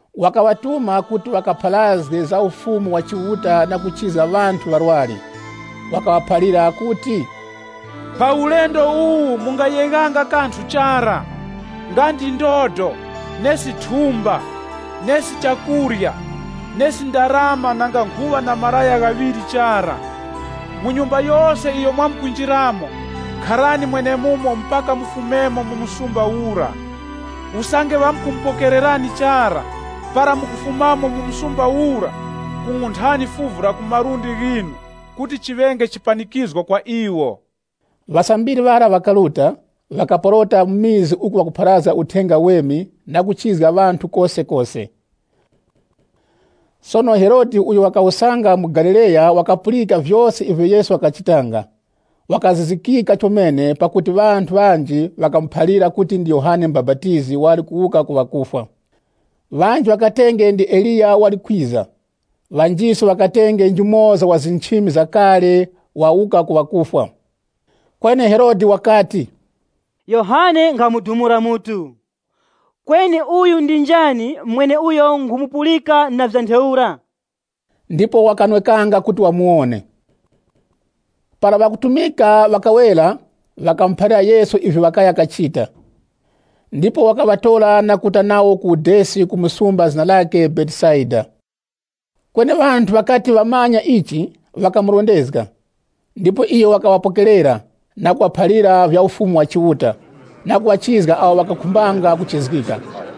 Wakaŵatuma kuti ŵakapharazge Ufumu wa Chiuta na kuchizga ŵanthu ŵarwari. Wakaŵaphalira kuti, “Pa ulendo uwu mungayeghanga kanthu chara, nga ndi ndodo, thumba, chakurya, ndarama. Ndipo mureke kuŵa na malaya ghaŵiri. Mu nyumba yose iyo mwamkunjiramo, kharani mwenemumo mpaka mufumemo mu msumba ura. Usange ŵakumupokererani chara, para mukufumamo mu muzi ura kung'unthani fuvu la ku malundi ghinu kuti chiŵenge chipanikizgo kwa iwo.” Ŵasambiri ŵara ŵakaruta, ŵakaporota mu vikaya kupharazga Uthenga Uweme na kuchizga ŵanthu kosekose. Sono Herode uyo wakawusanga mu Galileya yikapulika vyose ivyo Yesu wakachitanga, yikazizikika chomene, pakuti ŵanthu ŵanji ŵakayiphalira kuti ndi Yohane Mubapatizi wali kuwuka ku ŵakufwa. Ŵanji ŵakatenge ndi Eliya wali kwiza, ŵanjiso ŵakatenge njumoza wa nchimi za kale wawuka ku ŵakufwa. Kweni Herode wakati, “Yohane nkhamudumula mutu. Kweni uyu ndi njani mweneuyo nkhumupulika na vya ntheura?” Ndipo wakanwekanga kuti wamuwone. Para ŵakutumika ŵakawera, ŵakamuphalira Yesu ivyo ŵakaya kachita. Ndipo wakaŵatora na kuruta nawo ku udesi ku msumba zina lakhe Betesaida. Kweni ŵanthu ŵakati ŵamanya ichi, ŵakamurondezga. Ndipo iyo wakaŵapokerera, na kuŵaphalira vya Ufumu wa Chiuta, na kuŵachizga awo ŵakakhumbanga kuchizgika.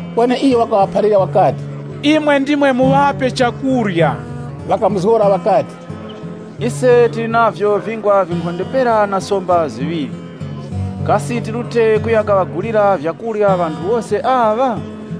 Kweni iyo wakaŵaphalira wakati, “Imwe ndimwe muŵape chakurya.” Ŵakamuzgora ŵakati, “Ise tili navyo vingwa vinkhonde pera na somba ziŵiri. Kasi tirute kuya kaŵagulira vyakurya ŵanthu wose aŵa?”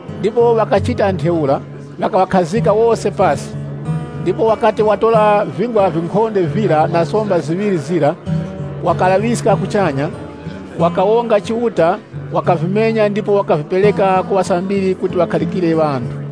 Ndipo ŵakachita ntheura, ŵakaŵakhazika wose pasi. Ndipo wakati watora vingwa vinkhonde vira na somba ziŵiri zira, wakalaŵiska kuchanya, wakawonga Chiuta, wakavimenya ndipo wakavipereka ku ŵasambiri kuti ŵakharikire ŵanthu.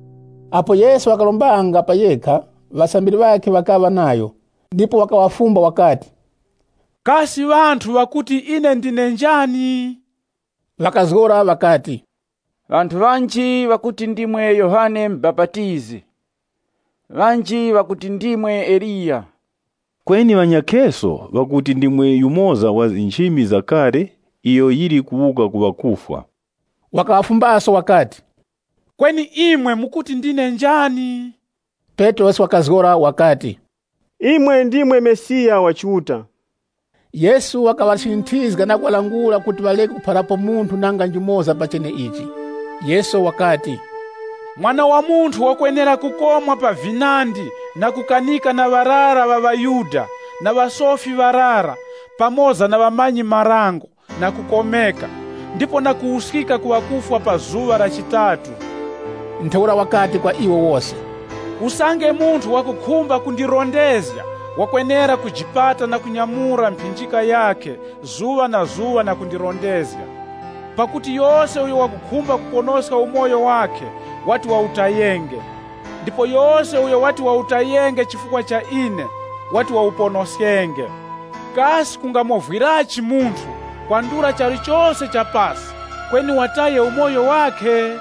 Apo Yesu wakarombanga pa yekha, ŵasambiri ŵakhe ŵakaŵa nayo. Ndipo wakaŵafumba wakati, “Kasi ŵanthu ŵakuti ine ndine njani?” Ŵakazgora ŵakati, “Ŵanthu ŵanji ŵakuti ndimwe Yohane Mubapatizi, ŵanji ŵakuti ndimwe Eliya, kweni ŵanyakheso ŵakuti ndimwe yumoza wa nchimi za kale iyo yili kuwuka ku ŵa kufwa.” Wakaŵafumbaso wakati, “Kweni imwe mukuti ndine njani?” Petrosi wakazgora wakati, “Imwe ndimwe Mesiya wa Chiuta.” Yesu wakaŵachinyinthizga na kuŵalangula kuti ŵareke kuphalirapo munthu nanga njumoza pa cheneichi. Yesu wakati, “Mwana wa Munthu wakwenera kukomwa pa vinandi na kukanika na ŵarara ŵa ŵaYuda, na ŵasofi ŵarara pamoza na ŵamanyi-marango, na kukomeka, ndipo na kuwuskika ku ŵakufwa pa zuŵa la chitatu.” Ntheura wakati kwa iwo wose, “Usange munthu wakukhumba kundirondezga, wakwenera kujipata na kunyamura mphinjika yakhe zuŵa na zuŵa na kundirondezga. Pakuti yose uyo wakukhumba kuponoska umoyo wakhe wati wawutayenge, ndipo yose uyo wati wawutayenge chifukwa cha ine, wati wawuponoskenge. Kasi kungamovwirachi munthu, kwandula charu chose cha pasi, kweni wataye umoyo wakhe?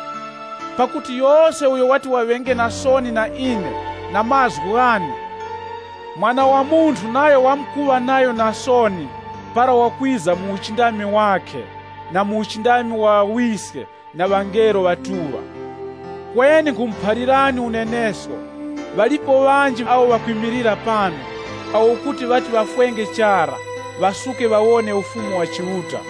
Pakuti yose uyo wati waŵenge na soni na ine na mazgu ghane, Mwana wa Munthu nayo wamkuŵa nayo na soni para wamkwiza mu uchindami wakhe na mu uchindami wa Ŵawiske na wa ŵangelo ŵatuŵa. Kweni nkhumuphalirani unenesko, ŵalipo ŵanji awo ŵakwimilira pano, awo kuti ŵati ŵafwenge chara ŵasuke ŵawone Ufumu wa Chiuta.”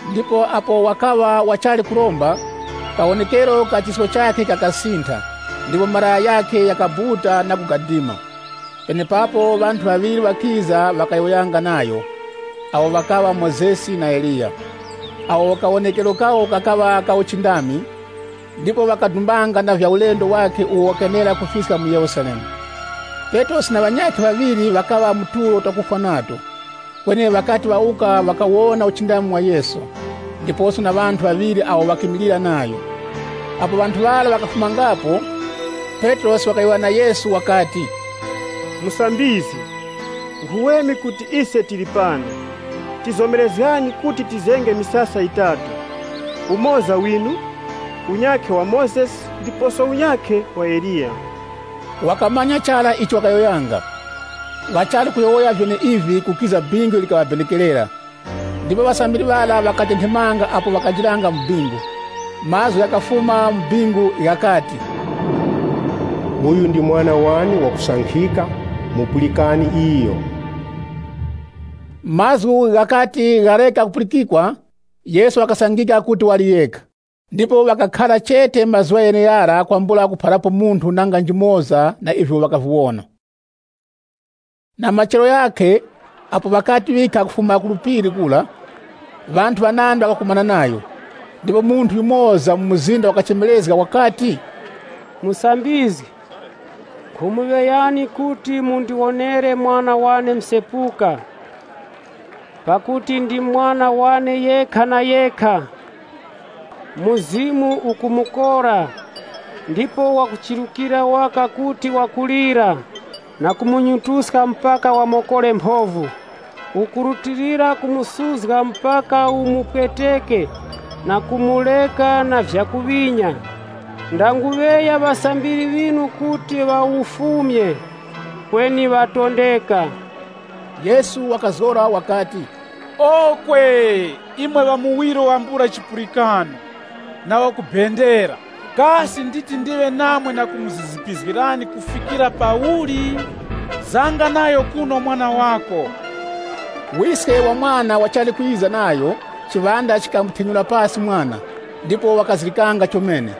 Ndipo apo wakaŵa ŵachali kuromba, kawonekero ka chisko chakhe kakasintha ndipo malaya ghakhe ghakabuta na kugadima. Penepapo ŵanthu ŵaŵiri ŵakiza, ŵakayowoyanga nayo, ŵeneawo ŵakaŵa Mozesi na Eliya. Ŵanthu aŵa kawonekero kawo kakaŵa ka uchindami, ndipo ŵakadumbanga na vya ulendo wakhe uwo wakenera kufiska mu Yerusalemu. Petrosi na ŵanyakhe ŵaŵiri ŵakaŵa mu tulo twakufwa nato. Kweni ŵakati ŵawuka ŵakawona uchindami wa Yesu, ndiposo na ŵanthu ŵaŵiri awo ŵakimilira nayo. Apo ŵanthu ŵara ŵakafumangapo, Petrosi wakayowoya na Yesu wakati, “Musambizgi, nkhuweme kuti ise tili pano. Tizomerezgani kuti tizenge misasa yitatu, umoza winu, unyakhe wa Mozesi ndiposo unyakhe wa Eliya.” (Wakamanya chara icho wakayowoyanga.) Ŵachali kuyowoya vyeneivi, kukiza bingu ilo likaŵabenekerera ndipo ŵasambiri ŵara ŵakatenthemanga apo wakanjiranga mu bingu. Mazgu ghakafuma mu bingu ghakati, “Uyu ndi Mwana wane wakusankhika. Mupulikani iyo.” Mazgu ghakati ghareka kupulikikwa, Yesu wakasangika kuti wali yekha. Ndipo ŵakakhara chete mazuŵa gheneghara kwambula kuphalirapo munthu nanga njumoza na ivyo ŵakaviwona. Na machero ghakhe, apo ŵakati ŵikha kufuma ku phiri kura, ŵanthu ŵanandi ŵakakumana nayo. Ndipo munthu yumoza mu mzinda wakachemerezga wakati, “Musambizgi, nkhumuŵeyani kuti mundiwonere mwana wane msepuka. Pakuti ndi mwana wane yekha na yekha. Ndipo mzimu ukumukora, ndipo wakuchirukira waka kuti wakulira, na kumunyutuska mpaka wamokore mphovu. Ukurutilira kumusuzga mpaka umupweteke ndipo ukufumamo na unonono chomene. Ndanguŵeya ŵasambiri ŵinu kuti ŵawufumye, kweni ŵatondeka.” Yesu wakazgora wakati, “Okwe! Imwe ŵamuwiro wambula chipulikano, na wakubendera! Kasi nditi ndiŵe namwe na kumuzizipizgirani kufikira pauli? Zanga nayo kuno mwana wako.” Wiske wa mwana wachali kwiza nayo, chiŵanda chikamuthenyura pasi mwana ndipo wakazirikanga chomene.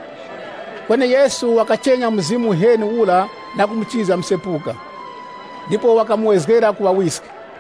Kweni Yesu wakachenya mzimu uheni ura na kumuchizga msepuka. Ndipo wakamuwezgera ku ŵawiske.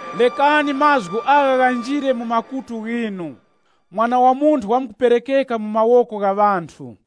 “Rekani mazgu agha ghanjire mu makutu ghinu. Mwana wa Munthu wamkuperekeka mu mawoko gha ŵanthu.”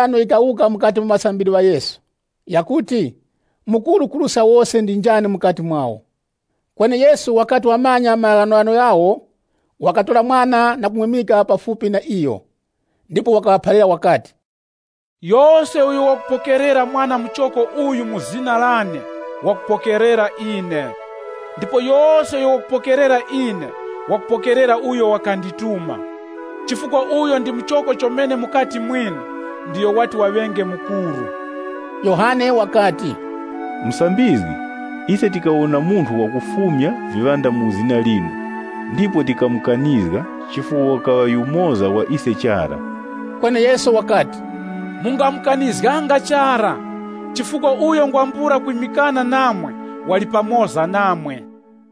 Ndipo mphindano yikawuka mukati mu ŵasambiri ŵa Yesu yakuti, mukuru kuruska wose ndi njani mukati mwawo. Kweni Yesu wakati wamanya maghanoghano ghawo, wakatora mwana na kumwimika pafupi na iyo. Ndipo wakaŵaphalira wakati, “Yose uyo wakupokerera mwana muchoko uyu mu zina lane, wakupokerera ine. Ndipo yose uyo wakupokerera ine, wakupokerera uyo wakandituma. Chifukwa uyo ndi muchoko chomene mukati mwinu, ndiyo wati waŵenge mukuru.” Yohane wakati, “Musambizgi, ise tikawona munthu wakufumya viŵanda mu zina linu, ndipo tikamukanizga chifukwa wakaŵa yumoza wa ise chara.” Kweni Yesu wakati, “Mungamukanizganga chara, chifukwa uyo ngwambula kwimikana namwe, wali pamoza namwe.”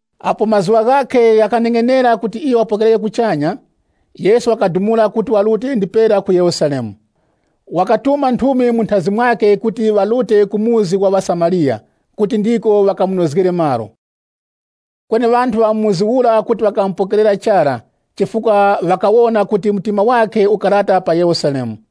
Apo mazuŵa ghakhe ghakaneng'enera kuti iyo wakapokerereke, Yesu wakadumula kuti warute ndipera ku Yerusalemu. Wakatuma nthumi munthazi mwakhe kuti ŵarute ku chikaya cha ŵaSamariya, kuti ndiko ŵakamunozgere malo. Kweni ŵanthu ŵa mu muzi ura kuti ŵakamupokerera chara chifukwa ŵakawona kuti mtima wakhe ukarata pa Yerusalemu.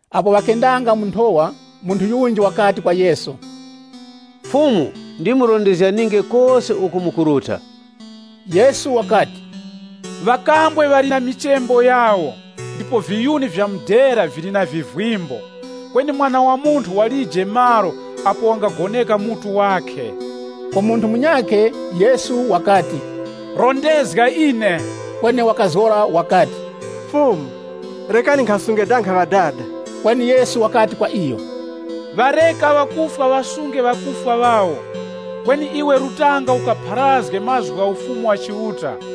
Apo ŵakendanga mu nthowa, munthu yunji wakati kwa Yesu, “Fumu, ndimurondezganinge kose uko mukuruta.” Yesu wakati, “Ŵakambwe ŵali na michembo yawo, ndipo viyuni vya mudera vili na vivimbo, kweni Mwana wa Munthu walije malo apo wangagoneka mutu wakhe.” Ku munthu munyakhe Yesu wakati, “Rondezga ine.” Kweni wakazgora wakati, “Fumu, rekani nkhasunge danga ŵadada.” Kweni Yesu wakati kwa iyo, “Ŵareka ŵakufwa ŵasunge ŵakufwa ŵawo. Kweni iwe rutanga ukapharazge mazgu gha Ufumu wa Chiuta.”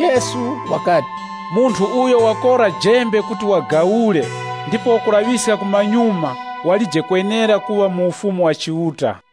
Yesu wakati, “Munthu uyo wakora jembe kuti wagawule ndipo wakulaŵiska kumanyuma walije kwenera kuŵa mu Ufumu wa Chiuta.”